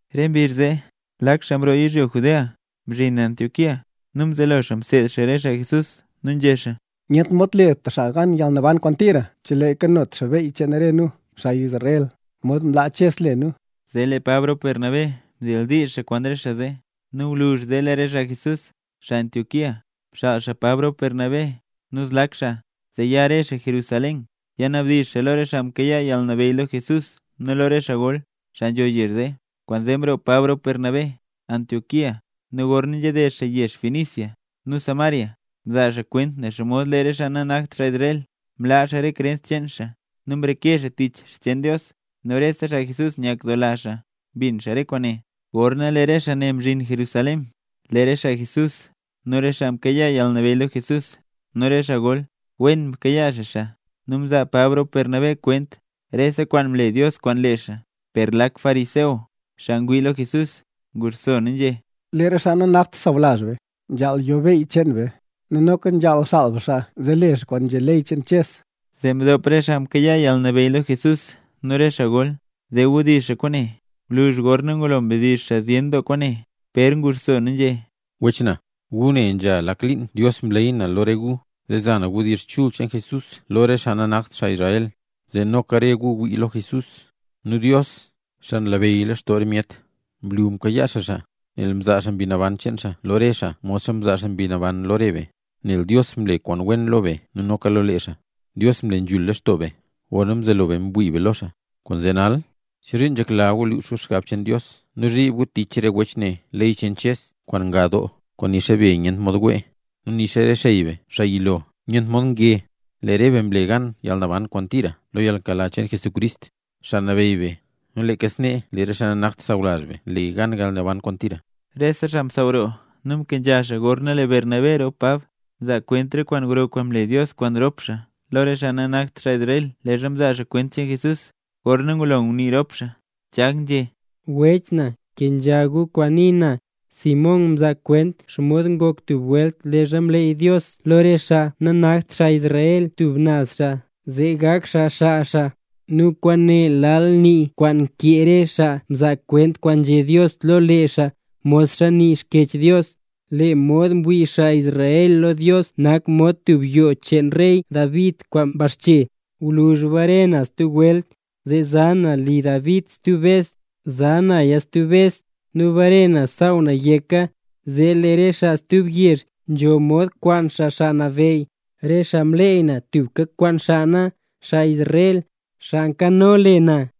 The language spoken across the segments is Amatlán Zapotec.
Re mbizh zee, lak xaa mroo yizhyo Judea mzhin Antioquía. Nu mzelo xaa mseed xaa re xaa Jesús, nu nzhé xaa: —Nyent mod le tub xaa gan yalnaban kwaan tira chelee xaa nanyot xaa beyy cheen re nu, xaa Israel, modxa mlaa Ches le nu. Zee lee Pab rop Bernabé mdildiizh xaa kwaan re xaa zee. Nu gwluzh zee lee re xaa Jesús, xaa Antioquía, mxaal Pab rop Bernabé nu zlak xaa, zee ya re xaa Jerusalén, yanabdizh xaa lo re xaa mkayaa yalnabeyy lo Jesús nu lo re xaa gol, xaa nzho yezh zee. Kwaanzee mroo Pab rop Bernabé Antioquía nu gorna nzhaded xaa yezh Fenicia nu Samaria mzaa xaa kwent xomod lee re xaa nanakt xaa Israel, mlaa xaa re krens cheen xaa nu mreke xaa tich xcheen Dios. Nu rese xaa Jesús nyakdoola xaa mbin xaa re kwaane. Gorna lee re xaa ne mzhin Jerusalén, lee re xaa Jesús nu re xaa mkayaa yalnabeyy lo Jesús nu re xaa gol wen mkayaa xaa xaa. Nu mzaa Pab rop Bernabé kwent rese kwaan mle Dios kwaan lee xaa. Per lak fariseo, xaa ngwii lo Jesús, nguxso nu nzhé: —Lee re xaa nanakt sawlazh be, nzhaal yo beyy cheen be, nu noka nzhaal xaal be xaa zee le xaa kwaan nzhé ley cheen Ches. Zee mdop re xaa mkayaa yalnabeyy lo Jesús nu re xaa gol, zee wdizh xaa kwaane. Gwluzh gorna mdizh xaa zyen doo kwaane, Pér nguxso nu nzhé: —Wech na, gu ne nzha lak liin Dios mleey na lo re gu zee za na wdizh chul cheen Jesús lo re xaa nanakt xaa Israel, zee noka re xaa ngwii lo Jesús. Nu Dios, xaa nlabeyy lextoo re myet, mlu mkayaa xaa xaa, nel mzaa xaa Mbi Naban cheen xaa lo re xaa modxa mzaa xaa Mbi Naban lo re be. Nel Dios mle kwaan wen lo be nu noka lo lee xaa; Dios mle nzhul lextoo be gorna mzelo be ngwii be lo xaa. Kwaanzee nal, ¿chozhiin nzhekla gu lux gu xgab cheen Dios nu zhib gu tich re wech ne ley cheen Ches kwaan nga doo kwaan nixa be nyent mod nge, nu nixa re xey be xaa yilo nyent mod wee? Lee re be mle gan yalnaban kwaan tira lo yalnkela cheen Jesucrist, Xaa Nabeyy be, nu leeka snee lee re xaa nanakt xaa sawlazh be le gan yalnaban kwaan tira. Rese xaa msaaw roo nu mkenzha xaa gorna lee Bernabé rop Pab mzaa kwent re kwaan gro kwaan mle Dios kwaan rop xaa lo re xaa nanakt xaa Israel, leezha mzaa xaa kwent cheen Jesús. Gorna ngulo ngunii rop xaa, Chag nzhé: —Wech na, kenzha gu kwaan nii na: Simón Pér mzaa kwent xomod ngoka tub welt leezha mleey Dios lo re xaa nanakt xaa Israel tub naz xaa zee gak xaa xaa xaa. Nu kwaane lal nii kwaan nkee re xaa mzaa kwent kwaan nzhé Dios lo lee xaa, modxa nii Xkyech Dios: Lee mod mwii xaa Israel lo Dios nak mod tub yoo cheen rey David kwaan mbaxche. Gwluzh bare na stub welt, zee za na li David stub bes. Za naya stub bes, nu bare na saaw na yeka, zee lee re xaa stub yezh nzho mod kwaan xaa Xaa Nabeyy, re xaa mleey na tubka kwaan xaa na, xaa Israel, xaa nkano le na.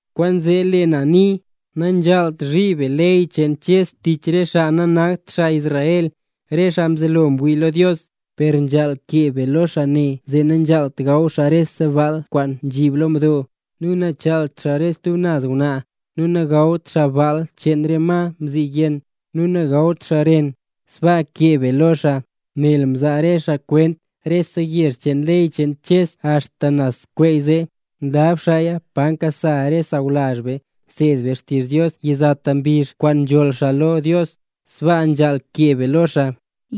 ’Kwaanzee lee na nii: Nanzhaalt zhib be ley cheen Ches tich re xaa nanakt xaa Israel, re xaa mzelo ngwii lo Dios. Per nzhaal kee be lo re xaa ne zee nagawt xaa rese baal kwaan nzhib lo mdo, nu nachaalt xaa re stub naz ngwnaa, nu nagawt xaa baal cheen re ma mziyenn, nu nagawt xaa ren. Sbaa kee be lo xaa, nel mzaa re xaa kwent rese yezh cheen ley cheen Ches axta nazskweeze. Nlab xaaya pa nkasa re xaa sawlazh be nseed be xtizh Dios yizata mbizh kwaan nzholl xaa lo Dios. Sbaa nzhaal kee be lo xaa.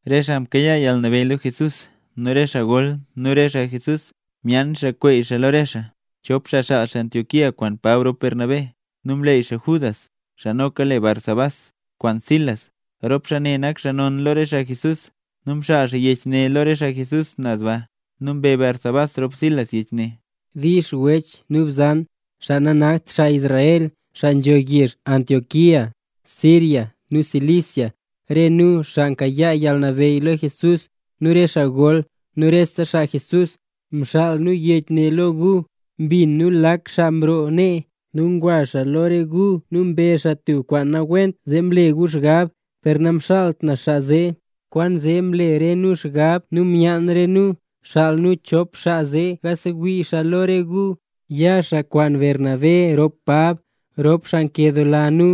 Re xaa mkayaa yalnabeyy lo Jesús nu re xaa gol nu re xaa Jesús, myaan xaa kweey xaa lo re xaa, chop xaa xaal xaa Antioquía kwaan Pab rop Bernabé. Nu mleey xaa Judas (xaa noka le Barsabás) kwaan Silas, rop xaa ne nak xaa non lo re xaa Jesús. Nu mxaal xaa yech ne lo re xaa Jesús naz ba, nu mbe Barsabás rop Silas yech ne: “Dix wech nu bzan, xaa nanakt xaa Israel, xaa nzho yezh Antioquía, Siria nu Cilicia. Re nu, xaa mkayaa yalnabeyy lo Jesús, nu re xaa gol, nu re xaa Jesús, mxaal nu yech ne lo gu. Mbin nu, lak xaa mroo nee nu ngwa xaa lo re gu nu mbezh xaa tub kwaan nawent zee mle gu xgab, per namxaalt nu xaa zee. Kwaanzee mle re nu xgab nu myaan re nu, xaal nu chop xaa zee yasewii xaa lo re gu. Ya xaa kwaan Bernabé rop Pab, rop xaa nkedoola nu.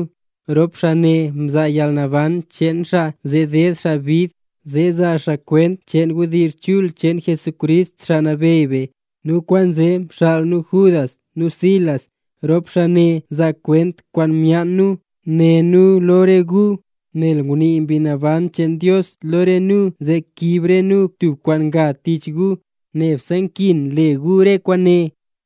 Rop xaa ne mzaa yalnaban cheen xaa zee ded xaa bid zaa xaa kwent cheen wdizh chul cheen Jesucrist, Xaa Nabeyy be. Nu kwaanzee nxaal nu Judas nu Silas. Rop xaa ne zaa kwent kwaan myaan nu né nu lo re gu. Nel ngunii Mbi Naban cheen Dios lo nu zee kiib re nu tub kwaan nga tich gu, nebse nkin le gu re kwaane.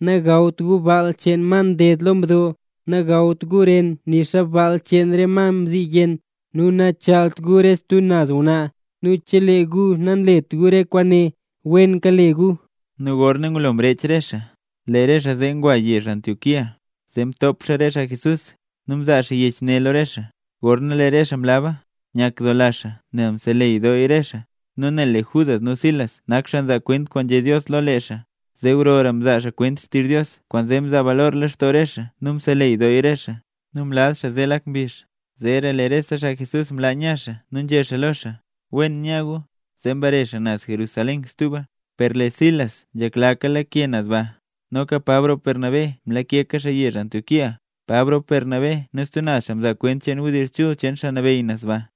Nagawt gu baal cheen ma mteed xaa lo mdo, nagawt gu ren nixa baal cheen ma mziyenn, nu nachaalt gu re stub naz ngwnaa. Nu chelee gu nanlet gu re kwaane, wen kale gu.” Nu gorna ngulo mrech re xaa, lee re xaa zee ngwa yezh Antioquía, zee mtop xaa re xaa Jesús, nu mzaa xaa yech ne lo re xaa. Gorna lee re xaa mlaba, nyakdoola xaa nel mseleyy dooya re xaa. Nu nel lee Judas nu Silas nak xaa nzaa kwent kwaan nzhé Dios lo lee xaa, zee gro mzaa xaa kwent xtizh Dios, kwaanzee mzaa xaa balor lextoo re xaa nu mseleyy doo xaa re xaa. Nu mlaz xaa zee lak mbizh, zeera lee rese xaa Jesús mlaa nya xaa nu nzhé xaa lo xaa: “Wen nya gu”, zee mbare xaa naz Jerusalén stuba. Per lee Silas nzhekla lakeka xaa naz baa. Noka Pab rop Bernabé mlakeka xaa yezh Antioquía, Pab rop Bernabé nu stub naz xaa mzaa kwent cheen wdizh chul cheen Xaa Nabeyy naz ba.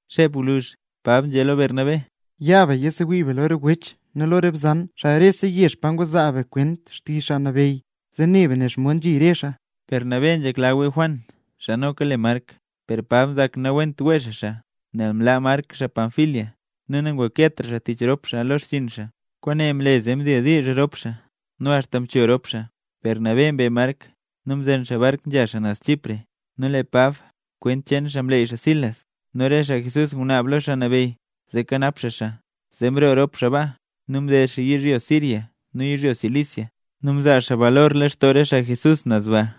Xep gwluzh Pab nzhé lo Bernabé: —Ya be yisewii be lo re wech nu lo re bzan xaa rese yezh pa ngwa zaa be kwent xtizh Xaa Nabeyy, zee ne be xomod nzhi re xaa. Bernabé nzhekla wee Juan, xaa noka le Mark, per Pab nzak nawent wee xaa xaa, nel mlaa Mark xaa Panfilia nu nangreketra xaa tich rop xaa lo xchiin xaa. Kwaane mle zee mdildiizh doo rop xaa, nu axta mcho rop xaa; Bernabé mbe Mark nu mzen xaa bark nzha xaa naz Chipre. Nu lee Pab kwent cheen xaa mleey xaa Silas. Nu re xaa Jesús ngunaab lo Xaa Nabeyy zee kanap xaa xaa. Zee mroo rop xaa baa, nu mded xaa yizhyo Siria nu yizhyo Cilicia, nu mzaa xaa balor lextoo re xaa Jesús naz ba.